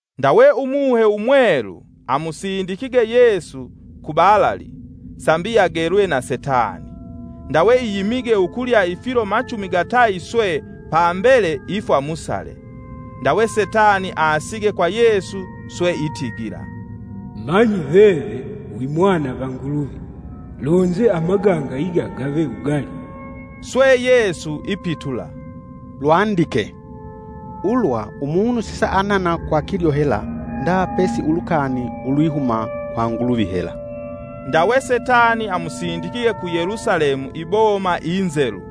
Ndawe Umuhe Umwelu amusindikige Yesu ku balali sambi agelwe na Setani. Ndawe iyimige ukulya ifilo machumi gatayi swe pambele ifwa musale. Ndawe Setani asige kwa Yesu swe itigila, “Manyi veve wi mwana va Nguluvi, lonze amaganga iga gave wugali.” Swe Yesu ipitula, “Lwandike ‘Ulwa umunu sisaanana kwa kilyo hela nda pesi ulukani ulwihuma kwa Nguluvi hela.’” Ndawe Setani amusindikige ku Yelusalemu iboma inzelu,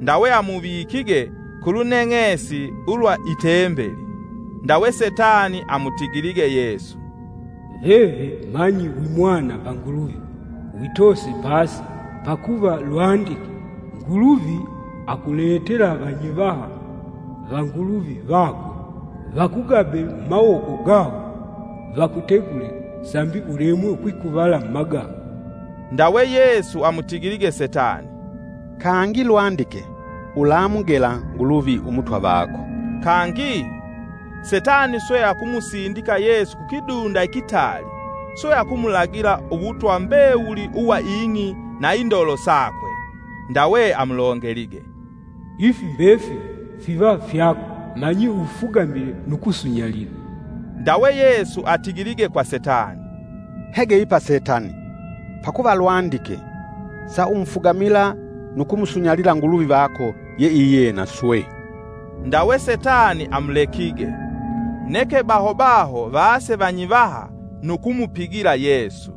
ndawe amuvikige kuluneng'esi ulwa itembeli, Ndawe Setani amutigilige Yesu, “Veve manyi wimwana va Nguluvi, witose pasi; pakuva lwandike: ‘Nguluvi akuletela Vanyivaha va Nguluvi vakwe vakugabe mumawoko gawo vakutegule, sambi ulemwe ukwikuvala mumaganga.’” Ndawe Yesu amutigilige Setani, “Kangi lwandike: ‘Ulamugela Nguluvi Umutwa vako.’” Kangi, Setani swe akumusindika Yesu kukidunda ikitali, swe akumulagila uwutwa mbewuli uwa ing'i na indolo sakwe. Ndawe amulongelige, “Ifi mbefili fiva fyako manyi ufugamile nu kusunyalila.” Ndawe Yesu atigilige kwa Setani, “Hege ipa Setani! Pakuva lwandike: ‘Saumufugamila nu kumusunyalila Nguluvi vako yeiyena swe.’” Ndawe Setani amulekige, neke baho baho vaase vanyivaha nu kumupigila Yesu.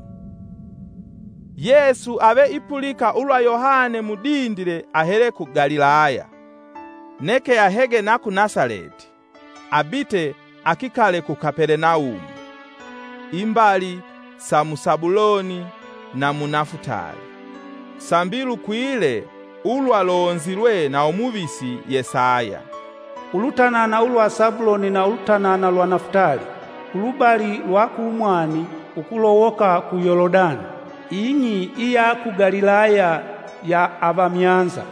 Yesu ave ipulika ulwa Yohane mudindile ahele ku Galilaya. Neke ahege na ku Nasaleti, abite akikale ku Kapelenaumu, imbali sa mu Sabuloni na mu Nafutali, Sambi lukwile ulwalonzilwe na umuvisi Yesaya: “Ulutanana ulwa Sabuloni na Ulutanana lwa Nafutali, kulubali lwa kumwani ukulowoka ku Yolodani, ing'i iya ku Galilaya ya avamyanza!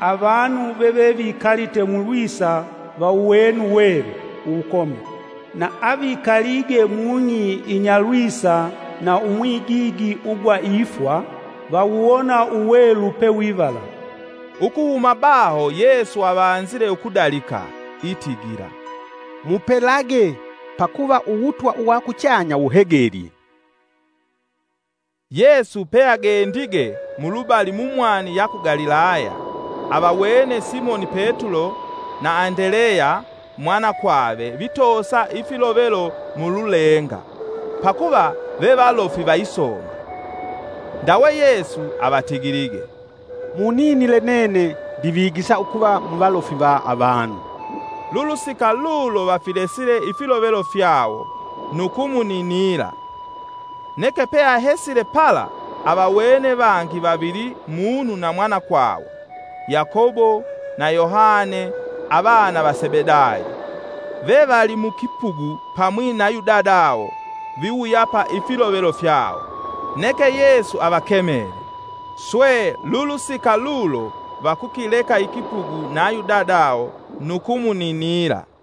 Avanu vevevikalite mulwisa vawuwene uwelu uwukomi. Na avikalige mung'i inyalwisa na umwigigi ugwa ifwa, vawuwona uwelu pe wivala.” Ukuhuma baho Yesu avanzile ukudalika, itigila, “Mupelage, pakuva Uwutwa uwakuchanya wuhegelye!” Yesu peagendige mulubali mumwani ya ku Galilaya, avawene Simoni Petulo na Andeleya mwanakwave vitoosa ifilovelo mululenga; pakuva vevalofi vaisomba. Ndawe Yesu avatigilige, “Muninile nene ndivigisa ukuva muvalofi va avanu.” Lulusika lulo vafilesile ifilovelo fyawo, nu kumuninila. Neke peahesile pala, avawene vangi vavili munu na mwanakwawo Yakobo na Yohane avana va Sebedayo, vevali mukipugu pamwi nayu dadawo, viwuyapa ifilovelo fyawo. Neke Yesu avakemele, Swe lulusika lulo vakukileka ikipugu nayu dadawo, nu kumuninila.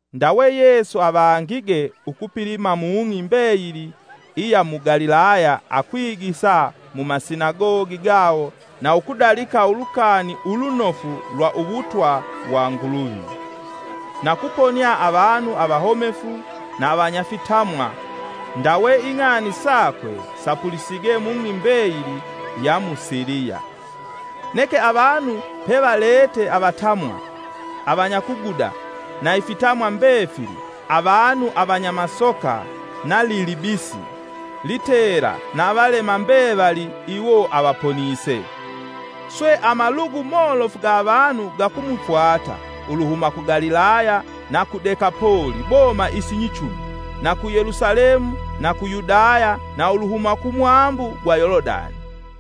Ndawe Yesu avangige ukupilima mung'i mbeyili iya mu Galilaya akwigisa mumasinagogi gawo na ukudalika Ulukani Ulunofu lwa Uwutwa wa Nguluvi. Na kuponia avanu avahomefu na avanyafitamwa. Ndawe ing'ani sakwe sapulisige mung'i mbeyili ya mu Siliya. Neke avanu pevalete avatamwa, avanyakuguda na ifitamwa mbefili; avanu avanya masoka, nalilibisi, litela na avalema mbevali iwo avaponise. Swe amalugu molofu ga avanu gakumufwata uluhuma ku Galilaya na ku Dekapoli (boma isinyichumi) na ku Yelusalemu na ku Yudaya na uluhuma kumwambu gwa Yolodani.